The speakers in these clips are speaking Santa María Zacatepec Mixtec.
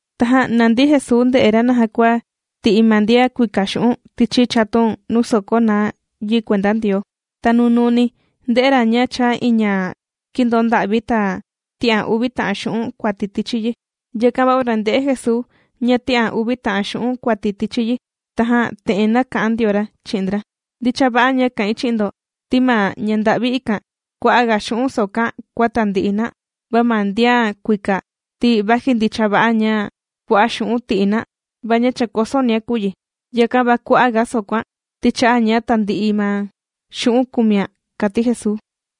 Tajan nàndi Jesuu ndè'e ra naja kua ti'i ma ndian kuika xu'un' tichi chatun nuu sòkó na yi kuenda Ndioo. Ta nunuuni ndē'e ra ña chàa iin ña kīndoo nda'vi, ta tī'an uvi ta'an xu'un' kuati tichi yi. Yakan va ora ndē'e Jesuu ña tī'an uvi ta'an xu'un' kuati tichi yi, tajan te'en nāka'an ndio ra chi'in ndra: ―Ndicha va'a ña kà'in chi'in ndo, ti ma ña nda'vi ikan kua'a' ga xu'un' sōkóan kua tandi'i na. Va ma ndian kuika ti vaji ndicha va'a ña kua'a' xu'un' tī'i na, va ña chàkosonia kùu yi. Yakan va kua'a' ga sōkóan ti chā'a ña tandi'i ma xu'un' kùmian ―kàti Jesuu.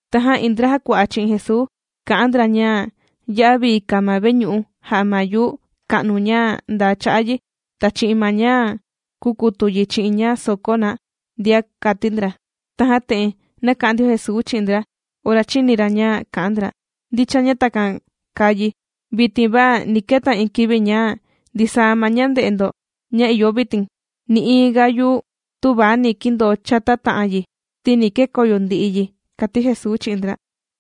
Tajan iin ndra jàkua'a chi'in Jesuu kà'an ndra ña ya'a vii kàa ma veñu'u jà'a ma yuu ka'nu ña ndaa cha'a yi ta chi'in ma ña kūkutu yi chi'in ña sōkó na ndia, kàti ndra. Tajan te'en nāka'an ndio Jesuu chi'in ndra ora chīni ra ña kà'an ndra: ―Ndicha ña takan kàa yi vitin va ni keta iin kivi ña ndisaa ma ña ndè'e ndo ña ìyo vitin, nï'iin ga yuu tüva ni kindoo chata ta'an yi, ti ni kekoyo ndi'i yi ―kàti Jesuu chi'in ndra.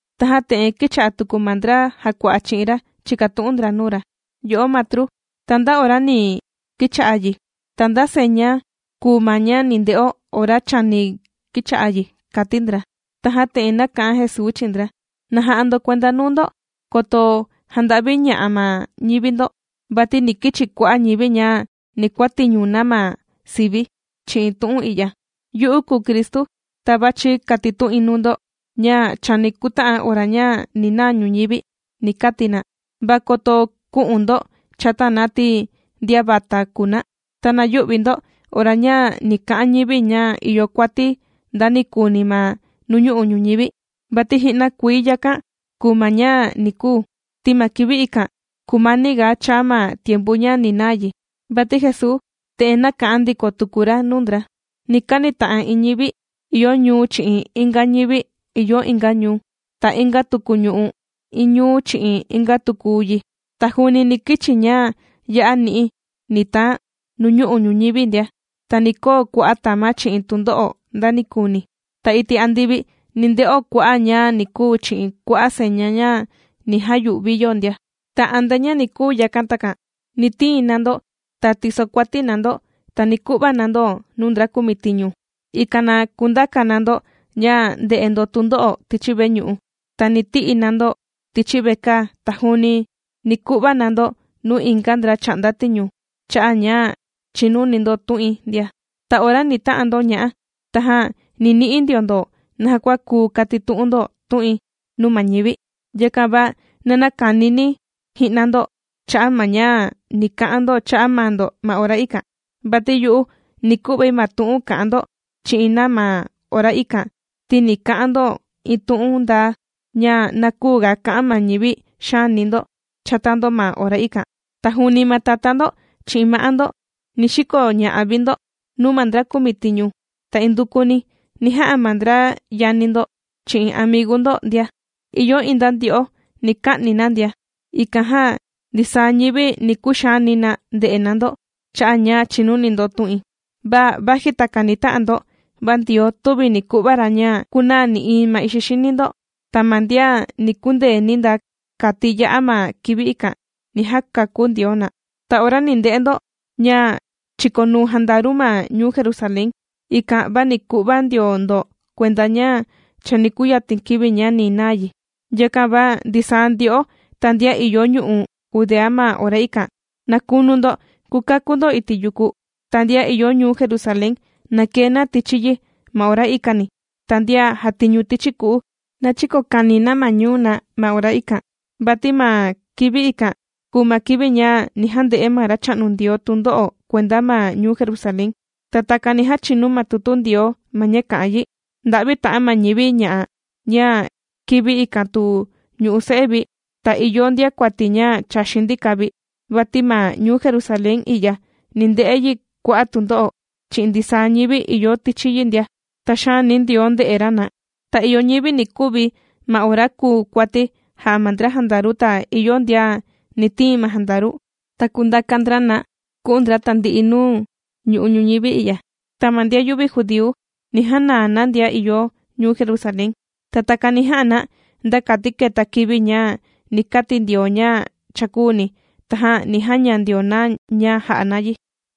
Tajan te'en kīcha'a tuku ma ndra jàkua'a chi'in ra chìkatu'un ndra nuu ra: ―Yo'o Matru, ¿ta nda ora ni kicha'a yi? ¿Ta nda seña kùu ma ña ni nde'o ora chani kicha'a yi? ―kàti ndra. Tajan te'en nāka'an Jesuu chi'in ndra: ―Na ja'a ndo kuenda nuu ndo koto janda'viña'a ma ñivi ndo. Vati ni kichi kua'a' ñivi ña ni kuàtiñu na ma sivi̱ chi'in tu'un i'ya: “Yu'u kùu Cristu, ta vàchi katitu'in nuu ndo ña chani kuta'an ora ña ni naa ñuñivi”, ni kati na. Va koto kü'un ndo chata na ti ndian vata kùu na. Ta na yü'vi ndo ora ña ni ka'an ñivi ña ìyo kuati ndanikuni ma nuu ñu'u' ñuñivi, vati ji'na kuii yakan kùu ma ña ni kuu. Ti ma kivi ikan kùmaniga chaa ma tiempu ña ni naa yi. Vati Jesuu te'en nāka'an ndiko tuku ra nuu ndra: ―Ni kanita'an iin ñivi ìyo ñuu chi'in inga ñivi ìyo inga ñuu. Ta inga tuku ñu'u' iin ñuu chi'in inga tuku yi. Ta juuni ni kichi ña ya'a ni'i ni taan nuñu'u' ñuñivi ndia. Ta ni koo kua'a' tama' chi'in tundo'o ndanikuni. Ta iti' andivi ni nde'o kua'a' ña ni kuu chi'in kua'a' seña ña ni jayu'vi yo ndia. ’Ta antea ña ni kuu yakan takan, ni tiin na ndo ta tisokuati na ndo, ta ni ku'va na ndo nuu ndra kumitiñu, ikan na kundaka na ndo ña nde'e ndo tundo'o tichi veñu'u, ta ni ti'i na ndo tichi vekaa, ta juuni ni ku'va na ndo nuu inga ndra chà'nda tiñu cha'a' ña chìnuni ndo tu'in ndia. Ta ora ni ta'an ndo ña'a tajan ni ni'i ndio ndo naja kua kuu katitu'un ndo tu'in nuu ma ñivi. Yakan va na näkanini ji'na ndo cha'a' ma ña ni ka'an ndo cha'a' maa ndo ma ora ikan, vati yu'u ni ku'vai ma tu'un ka'an ndo chi'in na ma ora ikan, ti ni ka'an ndo iin tu'un ndaa ña na küuga ka'an ma ñivi xaani ndo chata ndo ma ora ikan. Ta juuni ma tatá ndo chi'in ma'á ndo ni xikoña'a vi ndo nuu ma ndra kumitiñu. Ta indukuni ni ja'a ma ndra yani ndo, chi'in amigu ndo ndia. Ìyo iin nda ndyo'o ni ka'ni na ndia. Ikan jan ndisaa ñivi ni kuxaani na nde'e na ndo cha'a' ña chìnuni ndo tu'in. Va vaji takan ni ta'an ndo, va Ndioo tüvi ni ku'va ra ña kunaa nï'iin ma ixi xini ndo. Ta ma ndian ni kundeeni nda kati ya'a ma kivi ikan, ni jakakú Ndioo na. ’Ta ora ni nde'e ndo ña chīkonuu jandaru ma ñuu Jerusalén, ikan va ni ku'va ndio ndo kuenda ña chani kuyatin kivi ña ni naa yi. Yakan va ndisaa ndyo'o ta ndian ìyo ñu'u' Judea ma ora ikan, na kunu ndo kukakú ndo iti' yuku. Ta ndian ìyo ñuu Jerusalén, na kee na tichi yi ma ora ikani, ta ndian jàtiñu tichi ku'u, na chïkokani na ma ñuu na ma ora ikan. Vati ma kivi ikan kùu ma kivi ña ni jande'e ma Racha'nu Ndioo tundo'o kuenda ma ñuu Jerusalén. Ta takan ni jachinu ma tutu Ndioo ma ña kà'an yi. ¡Nda'vi ta'an ma ñivi ña'a ña kivi ikan tu ñù'u se'e vi, ta ìyo ndiakuati ña chàxin ndika vi! Vati ma ñuu Jerusalén i'ya ni nde'e yi kua'a' tundo'o chi'in ndisaa ñivi ìyo tichi yi ndia, ti xaani Ndioo nde'e ra na. Ta ìyo ñivi ni kuvi ma ora kùu kuati jà'a ma ndra jandaru ta ìyo ndian ni tiin ma jandaru, ta kundaka ndra na ku'un ndra tandi'i nuu ñu'u' ñuñivi i'ya. Ta ma ndian yüvi judíu, ni janaa na ndian ìyo ñuu Jerusalén. Ta takan ni ja'a na, nda kati keta kivi ña ni kati Ndioo ña cha kūuni, tajan ni jaña ndio na ña ja'a na yi.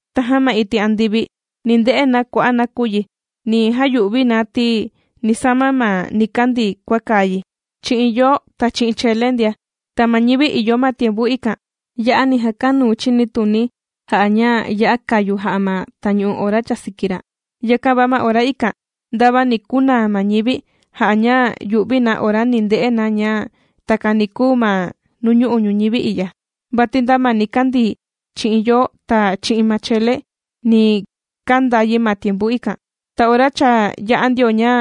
’Tajan ma iti' andivi ni nde'e na kua'a' nakuyi ña ni jayu'vi na, ti ni sama ma nikandii kua kàa yi chi'in yoo ta chele ndia. Ta ma ñivi ìyo ma tiempu ikan, ya'a ni jakanuu chinituni jà'a ña ya'a kàyu jà'a ma tañu'u ora chàsiki ra. Yakan va ma ora ikan ndava ni kunaa ma ñivi ja'a ña yu'vi na ora ni nde'e na ña takan ni kuu ma nuu ñu'u' ñuñivi i'ya. Vati nda ma nikandii chi'in yoo ta chi'in ma chele ni kanda yi ma tiempu ikan. Ta ora cha yā'a ndio ña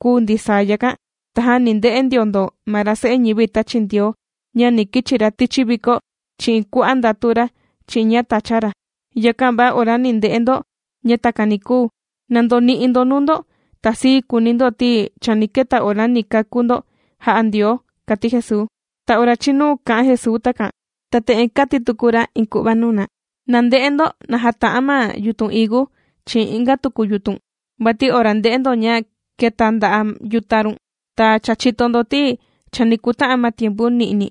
kūu ndisaa yakan, tajan ni nde'e ndio ndo ma ra Se'e ñivi tāchi Ndioo, ña ni kichi ra tichi viko chi'in kua'a' ndatu ra chi'in ña tàcha ra. Yakan va ora ni nde'e ndo ña takan ni kuu, na ndoni'i ndo nuu ndo ta sii kuuni ndo, ti chani keta ora ni kakú ndo jà'a Ndioo ―kàti Jesuu. Ta ora chīnu kā'an Jesuu takan, ta te'en kāti tuku ra iin ku'va nuu na: ―Na nde'e ndo naja tà'an ma yutun higu chi'in inga tuku yutun. Vati ora ndè'e ndo ña kèta nda'a' yuta' run, ta cha chìto ndo ti chani kuta'an ma tiempu ni'ni.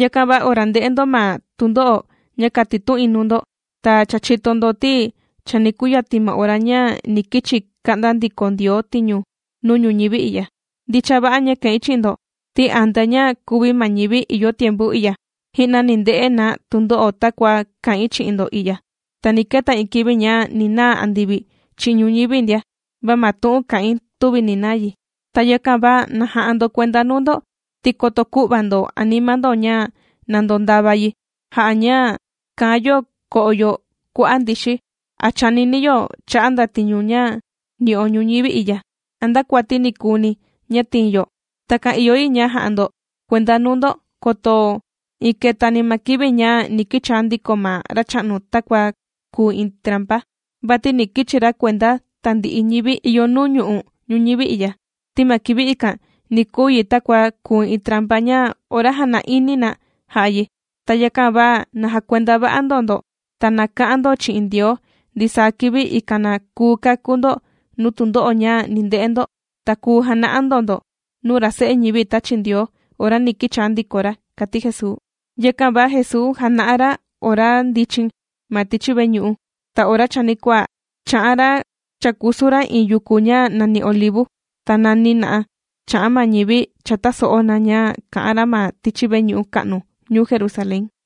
Yakan va ora ndè'e ndo ma tundo'o ña kàtitu'in nuu ndo, ta cha chìto ndo ti chani kuyatin ma ora ña ni kichi ka'nda ndiko Ndioo tiñu nuu ñuñivi i'ya. ’Ndicha va'a ña kà'in chi'in ndo ti antea ña kuvi ma ñivi ìyo tiempu i'ya, ji'na ni nde'e na tundo'o takua kà'in chi'in ndo i'ya. Ta ni keta iin kivi ña ni naa andivi chi'in ñuñivi ndia, va ma tu'un kà'in tüvi ni naa yi. ’Ta yakan va na ja'a ndo kuenda nuu ndo, ti koto kü'va ndo anima ndo ña na ndondava yi ja'a ña kàan yo ko'o yo kua'a' ndixi, a chànini yo cha'a' ndatiñu ña nì'o ñuñivi i'ya a nda kuati ni kuuni ña tiin yo. Takan ìyo yi ña ja'a ndo kuenda nuu ndo koto iin ketani ma kivi ña ni kichaa ndiko ma Racha'nu takua kùu iin trampa. Vati ni kichi ra kuenda tandi'i ñivi ìyo nuu ñu'u' ñuñivi i'ya. Ti ma kivi ikan ni kuu yi takua kùu iin trampa ña ora jàna'ini na jà'a yi. Ta yakan va na jakuenda va'a ndo ndo ta na ka'an ndo chi'in Ndioo ndisaa kivi, ikan na kuu kakú ndo nuu tundo'o ña ni nde'e ndo, ta kuu jana'a ndo ndo nuu ra Se'e ñivi tāchi Ndioo ora ni kichaa ndiko ra ―kàti Jesuu. Yakan va Jesuu jàna'a ra ora ndichin ma tichi veñu'u, ta ora chanikuaa chà'an ra chàkusu ra iin yuku ña nàni Olivu. Ta nani na'a chà'an ma ñivi cha tàso'o na ña kà'an ra ma tichi veñu'u ka'nu ñuu Jerusalén.